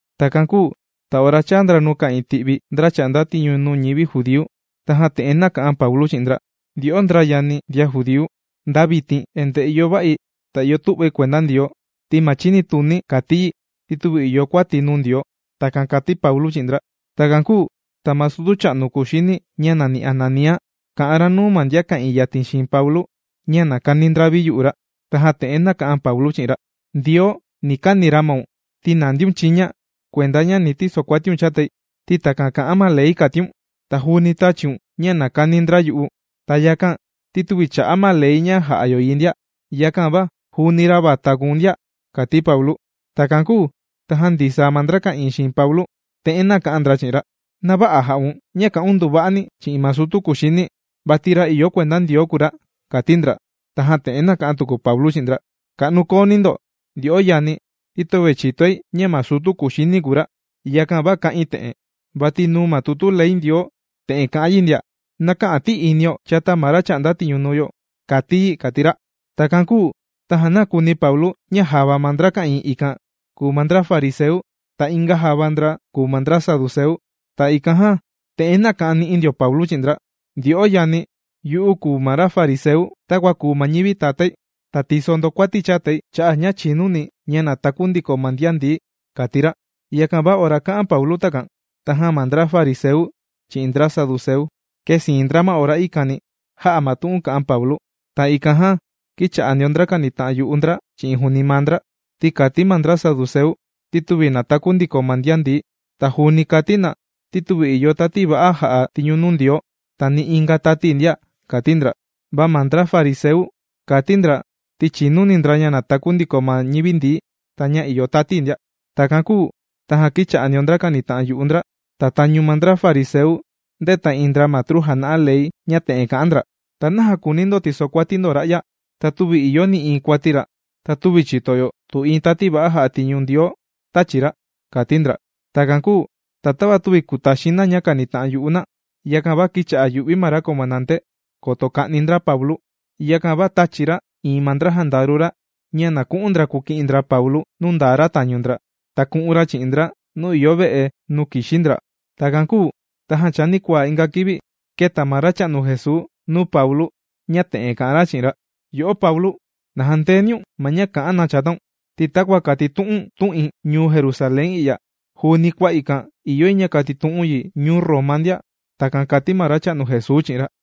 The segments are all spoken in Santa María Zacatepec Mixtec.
Takan kūu ta ora chāa ra nuu ka'ìin ti'vi ndra chà'nda tiñu nuu ñivi judíu tajan te'en nāka'an Paulu chi'in ndra: ―Ndyo'o ndra yani ndian judíu. Nda vitin endee ìyo va'i ta ìyo tu'vai kuenda Ndioo, ti ma chinituni̱ kàti yi ti tüvi ìyo kuati̱ nuu Ndioo. ―Takan kàti Paulu chi'in ndra. Takan kūu ta ma sutu cha'nu kuxini ña nàni Ananía, kà'an ra nuu ma ndian ka'ìin yatin xiin Paulu, ña na kani ndra viyu'u ra. Tajan te'en nāka'an Paulu chi'in ra: ―¡Ndioo, ni kani ra maun, ti nàndiun chiña kuenda ña na tisokuatiun chatai, ti takan kà'an ma ley kàtiun! Ta juuni tāchiun ña na kani ndra yu'u, ta yakan ti tüvi chà'a ma ley ña jà'a yo yi ndia. Yakan va juuni ra vata kùu̱n ndia ―kàti Paulu. Takan kūu tajan ndisaa ma ndra ka'ìin xiin Paulu, te'en nāka'an ndra chi'in ra: ―¡Na vä'a jà'un ña kà'un nduva'ani chi'in ma sutu kuxini, vati ra ìyo kuenda Ndioo kùu ra! ―kàti ndra. Tajan te'en nāka'an tuku Paulu chi'in ndra: ―Ka'nu kooni ndo ndyo'o yani, ti töve chìtoi ña ma sutu kuxini kùu ra, yakan va kā'in te'en. Vati nuu ma tutu ley Ndioo te'en kà'an yi ndia: “¡Na kä'an ti'inio chata ma ra chà'nda tiñu ñuu yo!”, kàti yi ―kàti ra. Takan kūu tajan nākuni Paulu ña java ma ndra ka'ìin ikan kùu ma ndra fariseu, ta inga java ndra kùu ma ndra saduceu. Ta ikan jan te'en nāka'an ni'i ndio ma Paulu chi'in ndra: ―Ndyo'o yani, yu'u kùu ma ra fariseu, takua kùu ma ñivi tatái. Ta tìso ndo kuati chatai, cha'a' ña chìnuni̱ ña nàtaku ndiko ma ndian ndií ―kàti ra. Yakan va ora kā'an Paulu takan tajan ma ndra fariseu chi'in ndra saduceu, kēsiin ndra ma ora ikani, jā'a ma tu'un kā'an Paulu. Ta ikan jan kīcha'a ndio ndra kànita'an yu'u ndra chi'in juuni maa ndra. Ti kàti ma ndra saduceu ti tüvi nàtaku ndiko ma ndian ndií. Ta juuni kàti na ti tüvi ìyo tati va'a jà'a tiñu nuu Ndioo ta ni inga tati ndia, kàti ndra. Va ma ndra fariseu, kàti ndra ti chìnuni ndra ña nàtaku ndiko ma ñivi ndií ta ña ìyo tati ndia. Takan kūu tajan kīcha'a ndio ndra kànita'an yu'u ndra. Ta tañu ma ndra fariseu ndēta iin ndra matru jàna'a ley ña te'en kà'an ndra: ―¿Ta naja kùuni ndo tisokuati ndo ra'ya? Ta tüvi ìyo nï'iin kuati ra, ta tüvi chìto yo tu iin tati va'a jà'a tiñu nuu Ndioo tāchi ra ―kàti ndra. Takan kūu ta tava tüvi kùtaxin na ña kànita'an yu'u na, yakan va kīcha'a yù'vi ma ra comandante, koto ka'ni ndra Paulu. Yakan va tāchi ra iin ma ndra jandaru ra ña na ku'un ndra kuki'in ndra ma Paulu nuu ndaa ra tañu ndra, ta ku'un ra chi'in ndra nuu ìyo ve'e nuu kìxi ndra. Takan kūu tajan chanikuaa inga kivi kēta ma Racha'nu Jesuu nuu Paulu ña te'en kà'an ra chi'in ra: ―Yo'o Paulu, na jandeeniun ma ña kà'an na chataun, ti takua kàtitu'u̱n tu'in ñuu Jerusalén i'ya, juuni kua ikan ìyo yi ña katitu'u̱n yi ñuu Roma ndia. ―Takan kàti ma Racha'nu Jesuu chi'in ra.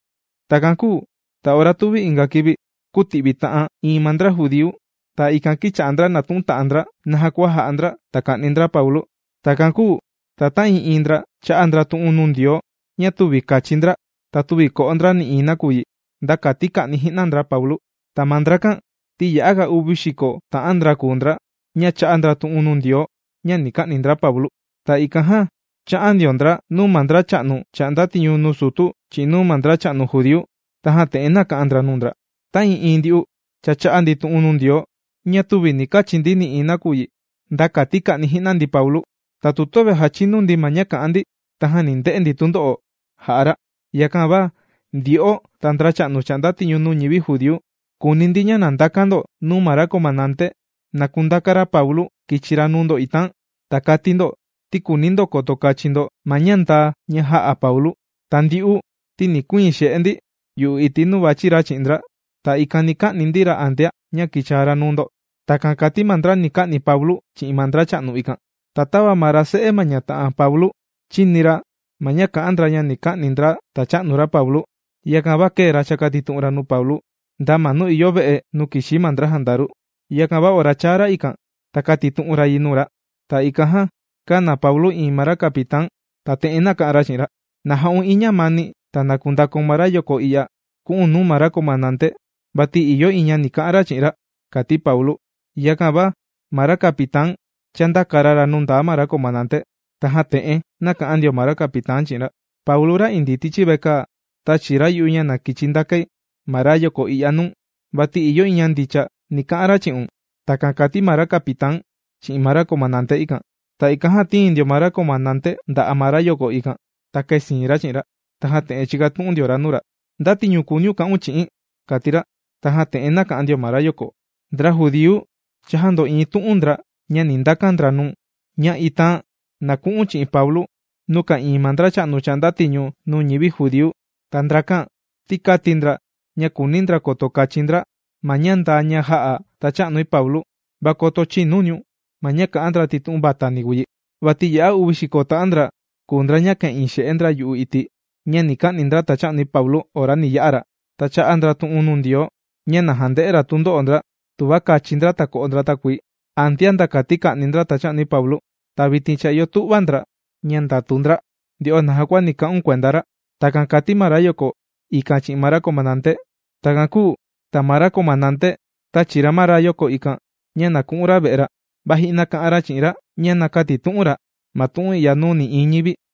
Takan kūu ta ora tuvi inga kivi kūti'vi ta'an iin ma ndra judíu. Ta ikan kīcha'a ndra nàtu'un ta'an ndra naja kua ja'a ndra ta ka'ni ndra Paulu. Takan kūu ta ta'ii'iin ndra chā'a ndra tu'un nuu Ndioo ña tüvi kachi ndra, ta tüvi ko'o ndra nï'iin nakuyi nda kati ka'ni ji'na ndra Paulu. Ta ma ndrakan ti ya'aga uvi xiko ta'an ndra kùu ndra ña chā'a ndra tu'un nuu Ndioo ña ni ka'ni ndra Paulu. Ta ikan jan chā'an ndio ndra nuu ma ndracha'nu chà'nda tiñu nuu sutu chi'in nuu ma ndracha'nu judíu, tajan te'en nāka'an ndra nuu ndra: ―Ta'ii'iin ndyu'u cha chā'a ndi tu'un nuu Ndioo ña tüvi ni kachi ndi nï'iin nakuyi, nda kati ka'ni ji'na ndi Paulu. Ta tu tüvi jachinu ndi ma ña ka'an ndi, tajan ni nde'e ndi tundo'o jà'a ra. Yakan va ndyo'o ta ndracha'nu chà'nda tiñu nuu ñivi judíu, kùuni ndi ña na ndakan ndo nuu ma ra comandante na kundaka ra Paulu kichi ra nuu ndo itaan. Ta kati ndo ti kùuni ndo koto kachin ndo ma ña ndaa ña jā'a Paulu. Ta ndyu'u ti ni kuiin xe'e ndi yu'u iti' nuu vàchi ra chi'in ndra. Ta ikan ni ka'ni ndi ra antea ña kichaa ra nuu ndo. ―Takan kàti ma ndra ni ka'ni Paulu chi'in ma ndracha'nu ikan. Va tava ma ra se'e ma ñata'an Paulu chīni ra ma ña kà'an ndra ña ni ka'ni ndra tacha'nu ra Paulu. Yakan va kēe ra chàkatitu'un ra nuu Paulu, nda ma nuu ìyo ve'e nuu kìxi ma ndra jandaru. Yakan va ora chāa ra ikan, ta kātitu'un ra yi nuu ra. Ta ikan jan kāna Paulu iin ma ra capitán, ta te'en nāka'an ra chi'in ra: ―¡Na ja'un iin ñamani ta na kundakaun ma rayoko i'ya ku'u̱n nuu ma ra comandante! Vati ìyo iin ña ni ka'an ra chi'in ra ―kàti Paulu. Yakan va ma ra capitán chāndaka ra ra nuu ma ra comandante, tajan te'en nāka'an ndio ma ra capitán chi'in ra: ―Paulu ra indii tichi vekaa, tāchi ra yu'u ña na kichi ndakai ma rayoko i'ya nuu̱n. Vati ìyo iin ña ndicha ni ka'an ra chi'un. ―Takan kāti ma ra capitán chi'in ma ra comandante ikan. Ta ikan jan tīin ndio ma ra comandante nda'a' ma rayoko ikan, ta kēsiin ra chi'in ra. Tajan te'en chīkatu'un ndio ra nuu ra: ―¿Nda tiñu kùuniun ka'un chi'i̱n? ―kàti ra. Tajan te'en nāka'an ndio ma rayoko: ―Ndra judíu cha jāndo'iin tu'un ndra ña ni ndakan ndra nuu̱n, ña itaan na ku'u̱n chi'in Paulu nuu ka'ìin ma ndracha'nu chà'nda tiñu nuu ñivi judíu. Ta ndrakan ti kāti ndra ña kùuni ndra koto kachin ndra ma ña ndaa ña jā'a tacha'nui Paulu. Va koto chïnuniun ma ña kà'an ndra ti tu'un vatani kùu yi. Vati ya'a uvi xiko ta'an ndra kùu ndra ña ka'ìin xe'e ndra yu'u iti' ña ni ka'ni ndra tacha'nui Paulu ora ni ya'a ra. Ta chā'a ndra tu'un nuu Ndioo, ña na jande'e ra tundo'o ndra tuva kachi ndra ta ko'o ndra takuii antea, nda kati ka'ni ndra tacha'nui Paulu. Ta vitin cha ìyo tu'va ndra ña ndàtu ndra nde'o naja kua ni ka'un kuenda ra. ―Takan kàti ma rayoko ikan chi'in ma ra comandante. Takan kūu ta ma ra comandante tāchi ra ma rayoko ikan ña na ku'un ra ve'e ra. Va ji'na kā'an ra chi'in ra ña na kätitu'un ra ma tu'un i'ya nuu nï'iin ñivi.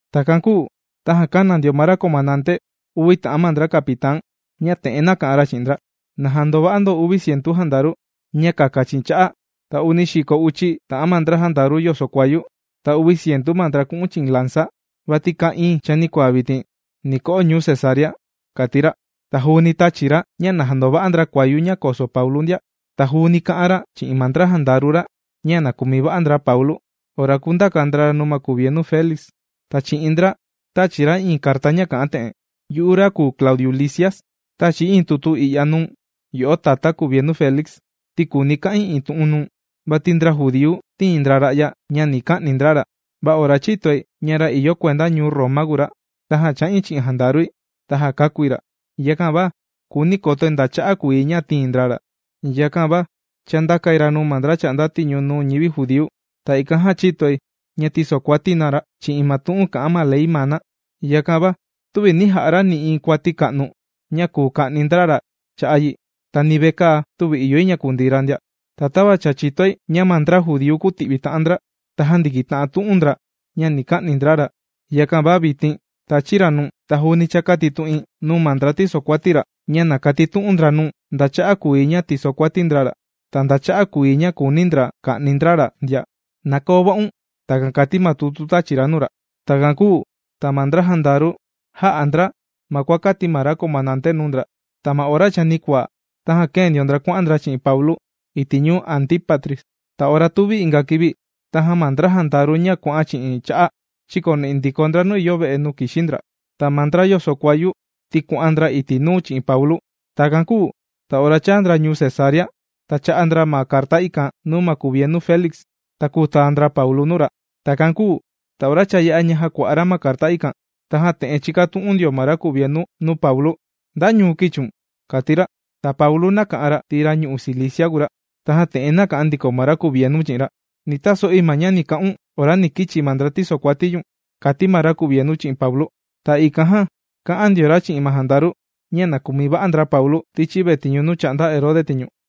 Takan kūu tajan kāna ndio ma ra comandante uvi ta'an ma ndra capitán ña te'en nāka'an ra chi'in ndra: ―Na jandova'a ndo uvi cientu jandaru ña kaka chi'in cha'a', ta uni xiko uchi ta'an ma ndra jandaru yoso kuayu, ta uvi cientu ma ndra ku'un chi'in lanza. Vati kaa iín chanikuaa vitin, ni ko'o ñuu Cesarea ―kàti ra. Ta juuni tāchi ra ña na jandova'a ndra kuayu ña koso Paulu ndia. Ta juuni kā'an ra chi'in ma ndra jandaru ra ña na kumi va'a ndra Paulu ora kundaka ndra ra nuu ma kuvienu Félix. Ta chi'in ndra tāchi ra iin carta ña ka'an te'en: “Yu'u ra kùu Claudiu Lisias, tàchi̱ iin tutu i'ya nuu̱n yo'o tatá kuvienu Félix ti kùuni̱ ka'in iin tu'un nuu̱n. Vati ndra judíu, tīin ndra ra'ya, ña ni ka'ni ndra ra. Va ora chītoi ña ra ìyo kuenda ñuu Roma kùu ra, tajan chā'in chi'in jandarui, ta jākakúi ra. Yakan va kùuni̱ kotoi nda cha'a' kùu yi ña tīin ndra ra, yakan va chāndakai ra nuu ma ndra chà'nda tiñu nuu ñivi judíu. Ta ikan jan chītoi ña tīsokuati na ra chi'in ma tu'un kà'an ma ley maa na. Yakan va tüvi nī ja'a ra nï'iin kuati ka'nu ña kùu ka'ni ndra ra cha'a' yi, ta ni vekaa tüvi ìyo yi ña kundii ra ndia. Ta tava cha chìtoi ña ma ndra judíu kūti'vi ta'an ndra, ta jāndikita'an tu'un ndra ña ni ka'ni ndra ra, yakan va vitin tàchi̱ ra nuu̱n. Ta juuni cha kātitu'in nuu ma ndra tìsokuati ra ña na katitu'un ndra nuu̱n nda cha'a' kùu yi ña tìsokuati ndra ra, ta nda cha'a' kùu yi ña kùuni ndra ka'ni ndra ra ndia. ¡Na koo va'un!” Takan kàti ma tutu tāchi ra nuu ra. Takan kūu ta ma ndra jandaru jā'a ndra ma kua kāti ma ra comandante nuu ndra. Ta ma ora chanikuaa, tajan kēe ndio ndra kuà'an ndra chi'in Paulu iti' ñuu Antípatris. Ta ora tuvi inga kivi, tajan ma ndra jandaru ña kuà'an chi'in cha'a, chīkoni'i ndiko ndra nuu ìyo ve'e nuu kìxi ndra. Ta ma ndra yoso kuayu ti kuà'an ndra iti' nuu chi'in Paulu. Takan kūu ta ora chāa ndra ñuu Cesarea, ta chā'a ndra ma carta ikan nuu ma kuvienu Félix, ta kūtaa ndra Paulu nuu ra. Takan kūu ta ora cha yā'a jàkua'a ra ma carta ikan, tajan te'en chīkatu'un ndio ma ra kuvienu nuu Paulu: ―¿Nda ñuu kīchiun? ―kàti ra. Ta Paulu nāka'an ra ti ra ñu'u' Cilicia kùu ra. Tajan te'en nāka'an ndiko ma ra kuvienu chi'in ra: ―Ni taso'i ma ña ni ka'un ora ni kichi ma ndra tìsokuati ñu̱n ―kàti ma ra kuvienu chi'in Paulu. Ta ikan jan kā'an ndio ra chi'in ma jandaru ña na kumi va'a ndra Paulu tichi vetiñu nuu chà'nda Herode tiñu.